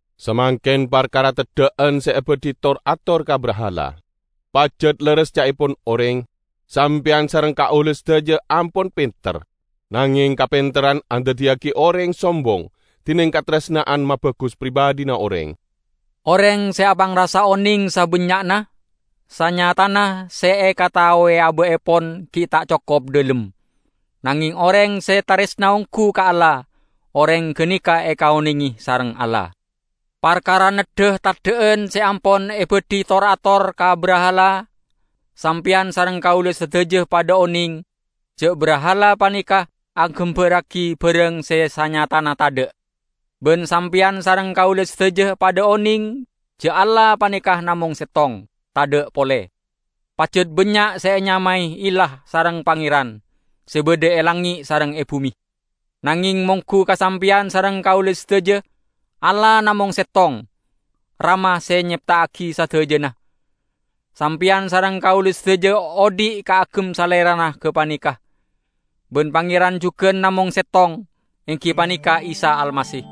Samangken parkara teddha'an se ebadhi tor-ator ka brahala. Pajat lerres ca'epon oreng, "Sampeyan sareng kaula sadaja ampon penter." Nangeng kapenterran andaddiyagi oreng sombong, dineng kataresna'an mabagus pribadhina oreng. Oreng se apangrasa oneng sabannya'na, sanyatana se ekataowe aba'epon gi' ta' cokop dhalem. Nangeng oreng se taresna onggu ka Allah, oreng ganeka ekaonenge sareng Allah. Parkara neddha teddha'an se ampon ebadhi tor-ator ka brahala, sampeyan sareng kaula sadaja padha oneng, ja' brahala paneka agambarragi barang se sanyatana tadha'. Ban sampeyan sareng kaula sadaja padha oneng ja' Allah paneka namong settong, tadha' pole. Pajat bannya' se enyamae illah sareng pangeran, se badha e langnge' sareng e bume. Nangeng monggu ka sampeyan sareng kaula sadaja, Allah namong settong, Rama se nyepta'agi sadajana. Sampeyan sareng kaula sadaja odhi' kaagem Salerana gapaneka. Ban Pangeran jugan namong settong, enggi paneka Isa Almasih.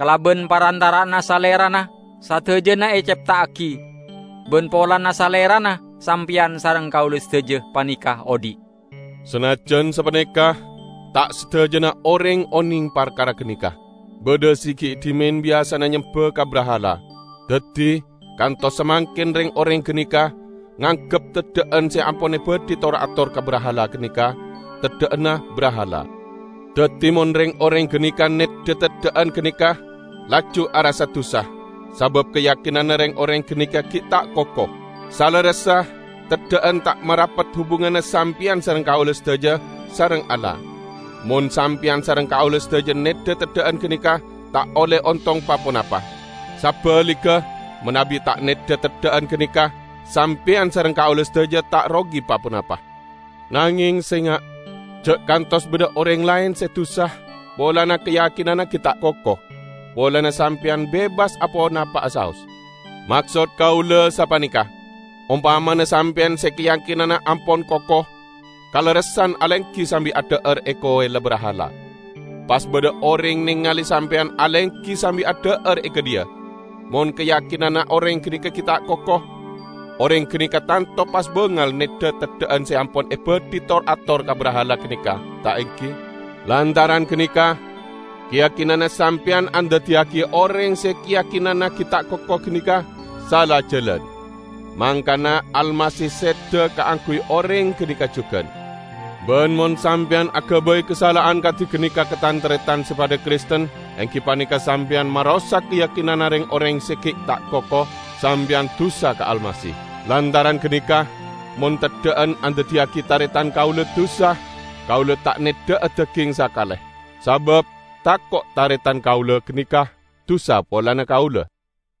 Kalaban parantara'anna Salerana sadajana ecepta'agi, ban polana Salerana sampeyan sareng kaula sadaja paneka odhi'. Sanajjan sapaneka, ta' sadajana oreng oneng parkara ganeka. Badha se gi' dhimen biyasana nyemba ka brahala. Daddi, kantos samangken reng-oreng ganeka nganggep teddha'an se ampon ebadhi tor-ator ka brahala ganeka, teddha'anna brahala. Daddi mon reng-oreng ganeka neddha teddha'an ganeka, laju arassa dusa; sabab kayakinanna reng-oreng ganeka gi' ta' koko. Salerressa, teddha'an ta' marapet hubunganna sampeyan sareng kaula sadaja sareng Allah. Mon sampeyan sareng kaula sadaja neddha teddha'an ganeka, ta' olle ontong pa-ponapa. Sabaligga, manabi ta' neddha teddha'an ganeka, sampeyan sareng kaula sadaja ta' rogi pa-ponapa. Nangeng, senga'! Ja' kantos badha oreng laen se dusa -- polana kayakinanna gi' ta' koko -- polana sampeyan bebas aponapa'a saos. Maksod kaula sapaneka: Ompamana sampeyan se kayakinanna ampon koko, kalerressan alenggi sambi adha'ar e kowella brahala. Pas badha oreng nengale sampeyan alenggi sambi adha'ar e gadhiya. Mon kayakinanna oreng ganeka gi' ta' koko, oreng ganeka tanto pas bangal neddha teddha'an se ampon ebadhi tor-ator ka brahala ganeka ta' enggi? Lantaran ganeka, kayakinanna sampeyan andaddiyagi oreng se kayakinanna gi' ta' koko ganeka sala jalan. Mangkana Almasih seda kaangguy oreng ganeka jugan. Ban mon sampeyan agabay kasala'an kadi ganeka ka tan-taretan se padha Kristen -- enggi paneka sampeyan marosak kayakinanna reng-oreng se gi' ta' koko -- sampeyan dusa ka Almasih. Lantaran ganeka, mon teddha'an andaddiyagi taretan kaula dusa, kaula ta' neddha'a daging sakale. Sabab tako' taretan kaula ganeka dusa polana kaula.